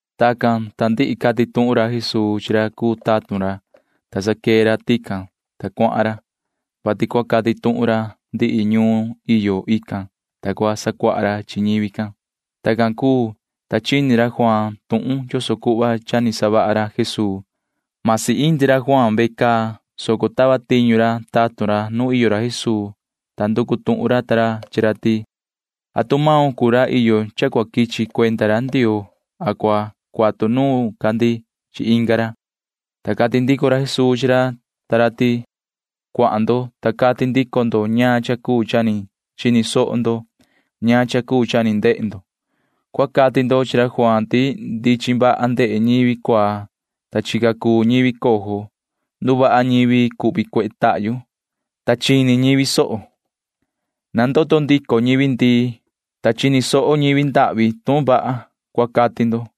Tacan, ta ndihi cati tuhun ra Jesuu chi ra cuu tatun ra, ta sa quee ra tican, ta cuahan ra, vati cua cati tuhun ra ndihi ñuun iyo ican, ta cua sacuaha ra chi ñivi can. Tacan cuu, ta chini ra Juaan tuhun yoso cuhva cha ni savaha ra Jesuu―masi indi ra Juaan can ve caa, soco tava tiñu ra tatun ra nu iyo ra Jesuu, ta nducu tuhun ra ta ra chi ra ti: ―¿Atu maun cuu ra iyo cha cua quichi cuenda ra Ndioo a cua cuatu nuun ca ndi chi inga ra? ―cati ra. Ta cati ndico ra Jesuu chi ra ta ra ti: ―Cuahan ndo, ta cati ndico ndo ñaan cha cuu cha ni chini soho ndo ñaan cha cuu cha ni ndehe ndo. Cua cati ndo chi ra Juaan ti ndichin vaha ndehe ñivi cuaa, ta chica cuu ñivi cojo. Nduvaha ñivi cuhvi cuehe tahyu, ta chini ñivi soho. Nandoto ndico ñivi ndii, ta chini soho ñivi ndahvi tuhun vaha, cua cati ndo.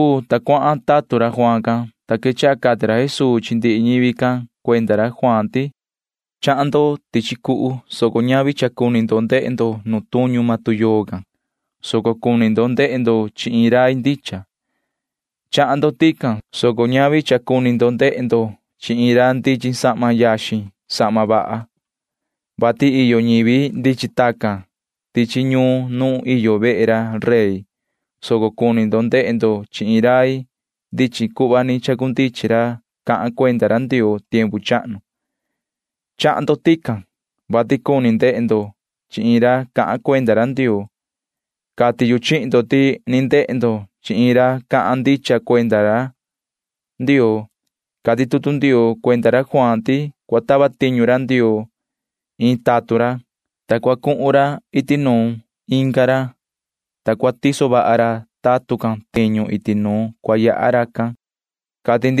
Tacan cuu, ta cuahan ra tatun ra Juaan can, ta quechaha cati ra Jesuu chi ndihi ñivi can cuenda ra Juaan ti: ―Chahan ndo tichi cuhu, soco ñavi vati cuni ndo ndehe ndo nu tuñu maan tuyoo can, [soco cuni ndo ndehe ndo chi iin rai ndicha]. Chahan ndo tican, soco ñavi vati cuni ndo ndehe ndo chi iin ra ndichin sahma yaxin sahma vaha, vati iyo ñivi ndichin tacan tichi ñuun nu iyo vehe ra rey, [soco cuni ndo ndehe ndo chi iin rai ndichin cuhva ni chacundichin ra cahan cuenda ra Ndioo tiempu chahnu]. Chahan ndo tican, vati cuni ndehe ndo chi iin ra cahan cuenda ra Ndioo. Cati yu chihin ndo ti ni ndehe ndo chi iin ra cahan ndicha cuenda ra Ndioo. Cati tutu Ndioo cuenda ra Juaan can ti cua tava tiñu ra Ndioo iin tatun ra, ta cua cuhun ra iti nuun inga ra, ta cua tiso vaha ra tatun can tiñu iti nu cua yaha racan, cati chi.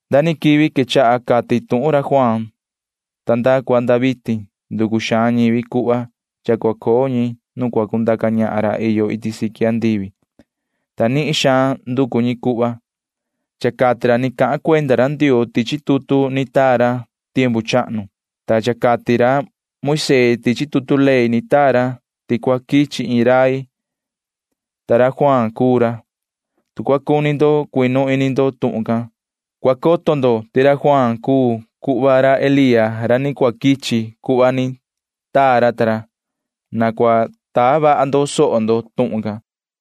’Nda ni quivi quechaha cati tuhun ra Juaan ta nda cua nda vitin nducu xaan ñivi cuhva cha cua coo ñi nu cua cundaca ñahan ra iyo iti siqui andivi, ta nihin xaan nducu ñi cuhva. Cha cati ra ni cahan cuenda ra Ndioo tichi tutu ni taa ra tiempu chahnu, ta cha cati ra Moisee tichi tutu ley ni taa ra ti cua quichi iin rai, ta ra Juaan cuu ra. Tu cua cuni ndo cuinu ini ndo tuhun can, cua coto ndo ti maan ra Juaan can cuu cuhva ra Elía ra ni cua quichi cuhva ni taa ra ta ra. Na cua taa vaha ndo soho ndo tuhun can.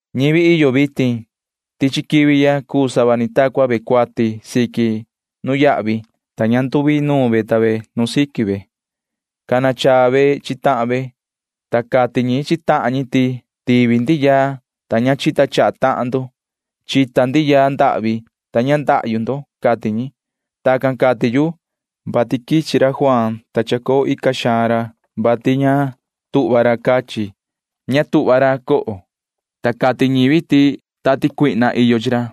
’Ñivi iyo vitin tichi quivi ya cuu sava ni ta cua ñi cuati siqui nuyahvi, [ta ña nduinuun ñi ta ñi nu siqui ñi]. Cana chaa ñi chi tahan ñi, ta cati ñi chi tahan ñi ti tivi ñi yaa, ta ña chita chaha tahan ñi. Chita ñi yaa ndii, ta ña cuvaa tahan ñi, cati ñi. [Tacan cati yu,] vati quichi ra Juaan, ta chacoo ica xaan ra, vati ña tuhva ra cachi. Ña tuhva ra coho, ta cati maan ñivi ti cha iyo iin tati cuihna chi ra.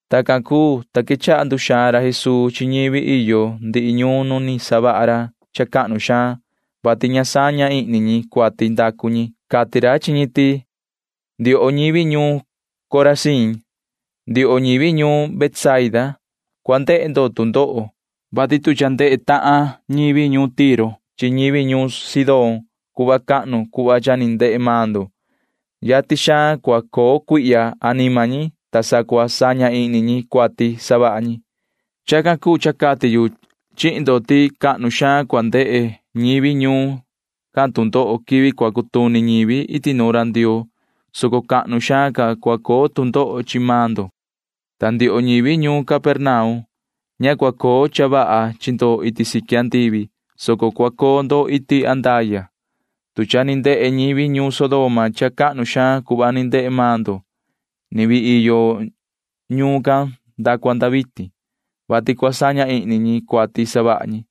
Tacan cuu, ta quechaha ra Jesuu nduxaan ra chi ñivi ndihi ñuun nu ni savaha ra cha cahnu ndicha, vati ña saña ihni ñi cuati ndacu ñi. Cati ra chi ñi ti: ―Ndioho ñivi ñuun Corazín, ndioho ñivi ñuun Betsaida, cua ndehe ndo tu ndoho, vati tu cha ndehe tahan ñivi ñuun Tiro chi ñivi ñuun Sidón cuhva cahnu cuhva cha ni ndehe maan ndo, yatin xaan cua coo cuihya anima ñi, ta sa cua saña ihni ñi cuati savaha ñi. Chacan cuu cha cati yu chihin ndo ti xaan cua ndehe ñivi ñuun can tu ndoho quivi cua cutuni ñivi iti nuun ra Ndioo, soco xaan ca cua coo tu ndoho chi maan ndo. Ta ndioho ñivi ñuun Capernaum, ña cua coo cha vaha chi ndo iti siqui andivi, soco cua coo ndo iti andaya. Tu cha ni ndehe ñivi ñuun Sodoma cuhva cahnu ndicha cuhva ni ndehe maan ndo, ni vii iyo ñuun can nda cua nda vitin, [vati cua saña ihni ñi cuati ni savaha ñi].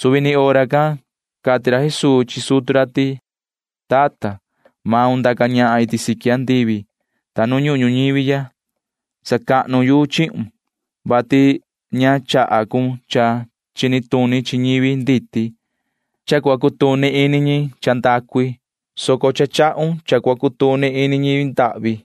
Suvi ni hora can cati ra Jesuu chi sutu ra ti: ―Tata, yoho ndaca ñahan iti siqui andivi ta nu ñuhun ñuñivi ya. Sacahnu yu chihun, vati ña chaha maun cha chini tuni chi ñivi nditi vaha xini, ta cutuni ini ñi cha ndacu i, soco cha chahun cha cua cutuni ini ñivi ndahvi.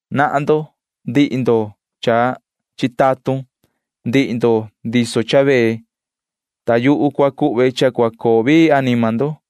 Nahan ndo, ndihi ndo cha chitatun, ndihi ndo ndiso cha vee, ta yuhu cua cuhve cha cua coo vii anima ndo.